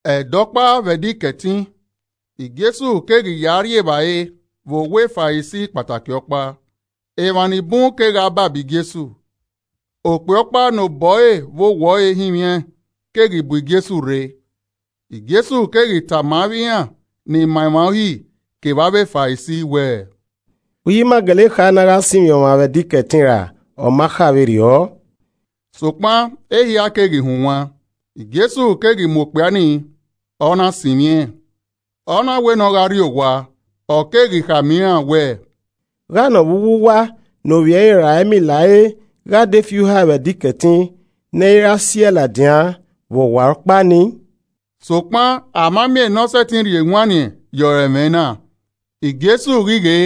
Ẹdẹ ọkpa, vbe Ẹdẹ Ikẹtin, Jesu keghi ya rri evbare vbe owa Farisi kpataki ọkpa, emwa ni bun kegha baba Jesu. Okpia ọkpa ne obọ ẹre vbe owẹ ọre hinmwiaẹn keghi bu Jesu rre. Jesu keghi yama avbe iran ni ma emwa Uhi kevbe avbe Farisi wẹẹ, “Uhi ima gele kha ne a gha sinmwi ọmwa vbe Ẹdẹ Ikẹtin ra ọ ma kha vberriọ?” Sokpan ehia keghi hunwan, Jesu keghi mu okpia nii, ọ na sinmwi ẹn, ọ na wẹ ne ọ gha rri owa. Ọ keghi khama iran wẹẹ, “Gha nọ vbe uwu uwa ne ovbi ẹre ra ẹmila ẹre gha de fi uhae vbe Ẹdẹ Ikẹtin ne ẹ i ra si ẹe ladian vbe ọwarọkpa nii?” Sokpan a ma miẹn ne ọ sẹtin rhie ewanniẹn ye ọre ẹmwẹ na. Jesu ghi ghe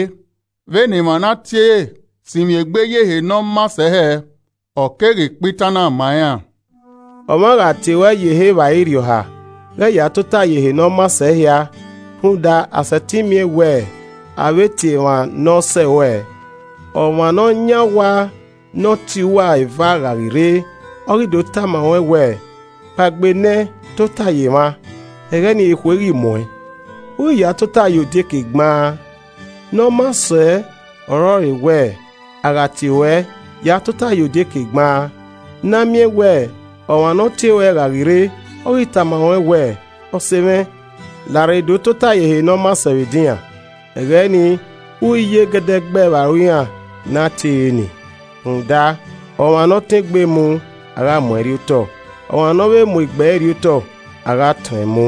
vbene emwa ne a tie re sinmwi egbe ye ehe ne ọ maa sẹ hẹẹ, ọ keghi kpa itan na ma iran, “Ọmwa gha tie ruẹ ye ehe evbare irhiọha ghẹ ya tota ye ehe ne ọ maa sẹ ehia, rhunmwuda a sẹtin miẹn wẹ a vbe tie emwa ne ọ sẹ ruẹ. Ọmwa ne ọ yan owa ne ọ tie uwa eva gha ghi rre, ọ ghi do tama ruẹn wẹẹ, ‘Kpaegbe nẹẹn tota ye emwa.’ Ẹghẹ nii ekhue ghi mu uẹn, u ghi ya tota ye odieke gbaan. Ne ọ maa sẹ ọrọre wẹẹ, a gha tie ruẹ, ya tota ye odieke gbaan, ne a miẹn wẹ ọmwa ne ọ tie ruẹ gha ghi rre, ọ ghi tama ruẹn wẹ, ‘Ọse mwẹ, larre do tota ye ehe ne ọ maa sẹ vbe edinran.’ Ẹghẹ nii, u ghi ye gẹdẹgbẹẹ vbe aro iran ne a tiere nii. Rhunmwuda, ọmwa ne ọ tọn egbe mu, a gha mu ẹn rriotọ, ọmwa ne ovbe mu egbe ẹre rriotọ, a gha tọẹn mu.”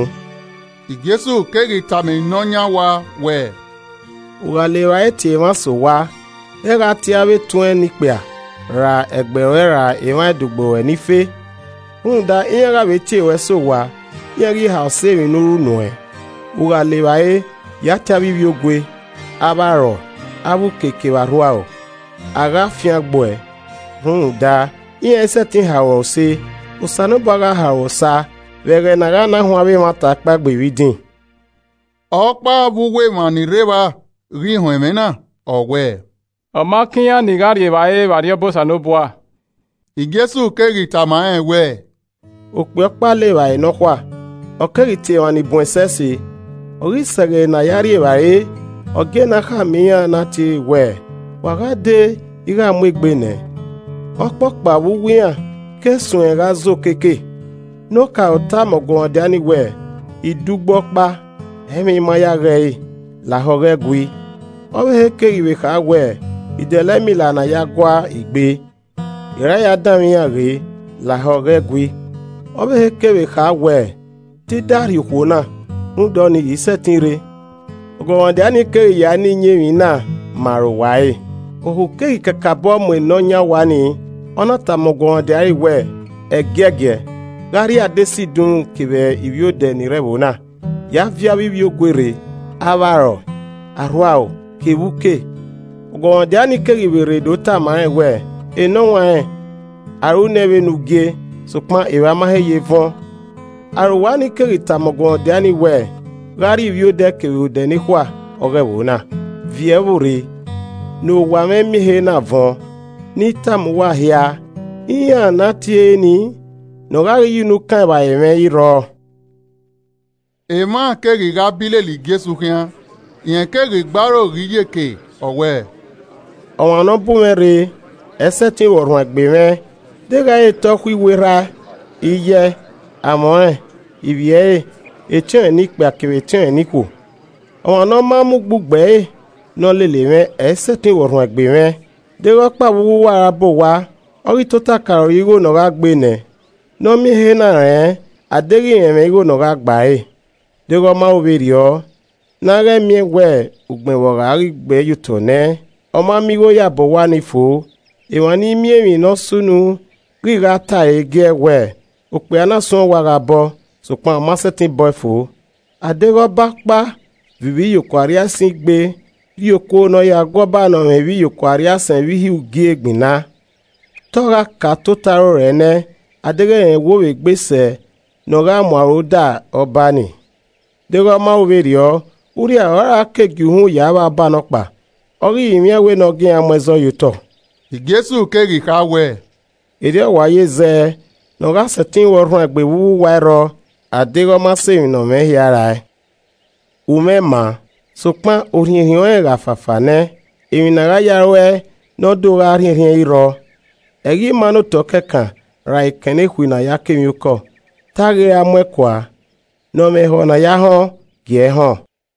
Jesu keghi tama ne ọ yan owa wẹẹ, “U gha le evbare tie emwa sẹ owa, ghẹ gha tie avbe etuẹn ne ikpia ra ẹgbẹe ruẹ ra emwa ẹdogbo ruẹ ni fe, rhunmwuda iran gha vbe tie ruẹ sẹ owa. iran ghi ha osa emwi ne u ru nuẹn. U gha le evbare, ya tie avbe ivbiogue, avbe arọe, avbe uke kevbe arhuaro, a gha fiangbuẹ, rhunmwuda iran i sẹtin ha ruẹ use. Osanobua gha ha ruẹ osa vbe ẹghẹ ne a gha na huẹn avbe emwata kpaegbe vbe idin.” Ọkpa vbe uwu emwa ni rre evba ghi họn ẹmwẹ na, ọ wẹẹ, “Ọ ma kan iran ni gha rri evbare vbe Arriọba Osanobua.” Jesu keghi tama rẹn wẹẹ, “Okpia ọkpa le evbare nọkhua, ọ keghi tie emwa ni bun ẹsẹse. Ọ ghi sẹ ẹghẹ ne a ya rri evbare, ọ gie ne a khama iran ne ọ tiere wẹẹ, ‘Wa gha dee ighe a mu egbe nẹ.’ Ọkpọkpa vbe uwu iran keghi suẹn gha zẹ okeke. Ne okaro tama ọguọmwadia nii wẹẹ, ‘I dẹ ugbo ọkpa, ẹ i mwẹ I ma ya ghe ẹre, lahọ ghẹ gui.’ Ọvbehe keghi vbe kha wẹẹ, ‘I dẹlẹ ẹmila ne a ya gua igbe, I ra ya danmwẹ iran ghe, lahọ ghẹ gui.’ Ọvbehe kevbe kha wẹẹ, ‘Te I da rhie okhuo na, rhunmwuda ọnii, I i sẹtin rre.’ Ọguọmwadia nii keghi ya na iyẹn emwi na ma arowa ẹre. Ohu keghi kakabọ mu ne ọ yan owa nii, ọna tama ọguọmwadia ẹre wẹẹ, ‘Ẹgiẹgiẹ, gha rrie adesẹ idunmwu kevbe ivbiodẹ ni re ẹvbo na, ya viọ avbe ivbiogue rre, avbe arọe, arhuaro kevbe uke.’ Ọguọmwadia nii keghi vbe rre do tama rẹn wẹẹ, ‘Enọwanrẹn, a ru nẹ vbe ne u gie, sokpan evba ma he ye vẹn.’ Arowa nii keghi khama ọguọmwadia nii wẹẹ, ‘Gha rrie ivbiodẹ kevbe odẹ nekhua ọghe ẹvbo na, viọ ẹvbo rre, ne owa mwẹ miẹn ehe na vuọn. Ne I tama uwa hia, iran ne a tiere nii, ne ọ gha ghi ye unu kan evbare mwẹ, ẹ i rrọọ.’” Emwa keghi gha bi lele Jesu khian, rẹn keghi gbe aro ghe iyeke ọ wẹẹ, “Ọmwa ne ọ bu mwẹ rre, ẹ i sẹtin ru ọrhuanegbe mwẹ, deghẹ i re te ọ khuiwu erha ẹe, iye ẹe, amwẹ ọnrẹn, ivbi ẹre, etiọnrẹn ne ikpia kevbe etiọnrẹn ne ikhuo. Ọmwa ne ọ ma mu ugbugbe ẹre ne ọ lele mwẹ, ẹ i sẹtin ru ọrhuanegbe mwẹ. Deghẹ ọkpa vbe uwu uwa ra bọ owa, ọ ghi tota ka roro igho ne ọ gha gbe nẹ, ne ọ miẹn ehe na rẹn a deghẹ rẹn mwẹ igho ne ọ gha gba ẹre. Deghẹ ọ ma ru vberriọ, na ghẹ i miẹn wẹ ugbẹn vbe ọ gha ghi gbe ẹyotọ nẹ, ọ ma miẹn igho ya bọ owa ni fo, emwa ni miẹn emwi ne ọ sunu ghi gha ta ẹre giẹ, wẹ, ‘Okpia na suẹn owa gha bọ, sokpan ọ ma sẹtin bọe fo.’ A deghẹ ọba ọkpa viọ ivbiyokuo arriaisẹn igbe rrie okuo ne ọ ya gu ọba ne ọ mwẹ ivbiyokuo arriaisẹn vbe ihe ugie gbinna, te ọ gha ka tota rorọe nẹ a deghẹ rẹn wo vbe egbe sẹ ne ọ gha mu aro da ọba nii. Deghẹ ọma ru vberriọ, urria ọre ọ ra na gie uhunmwu ya vba ọba nọkpa, Ọ ghi rinmwian ẹn wẹ ne ọ gie iran mu ẹzọ ye otọ.” Jesu keghi kha wẹẹ, “Erriọ ọ wa ye zẹ, ne ọ gha sẹtin ru ọrhuanegbe vbe uwu uwa i rrọọ a deghẹ Ọ ma sẹ emwi nẹ ọ mwẹ hia rae. “Umwẹ maa, sokpan orhiẹnrhiẹn ọnrẹn gha fafa nẹ, emwi ne a gha ya ruẹe ne ọ do gha rhiẹnrhiẹn i rrọọ. Ẹ i ghi maa ne otọ kẹkan ra ekẹn nekhui ne a ya kọ emwiokọ, te a ghi ra mu ẹn kua. Ne ọ mwẹ ehọ ne a ya họn, gie ẹe họn!”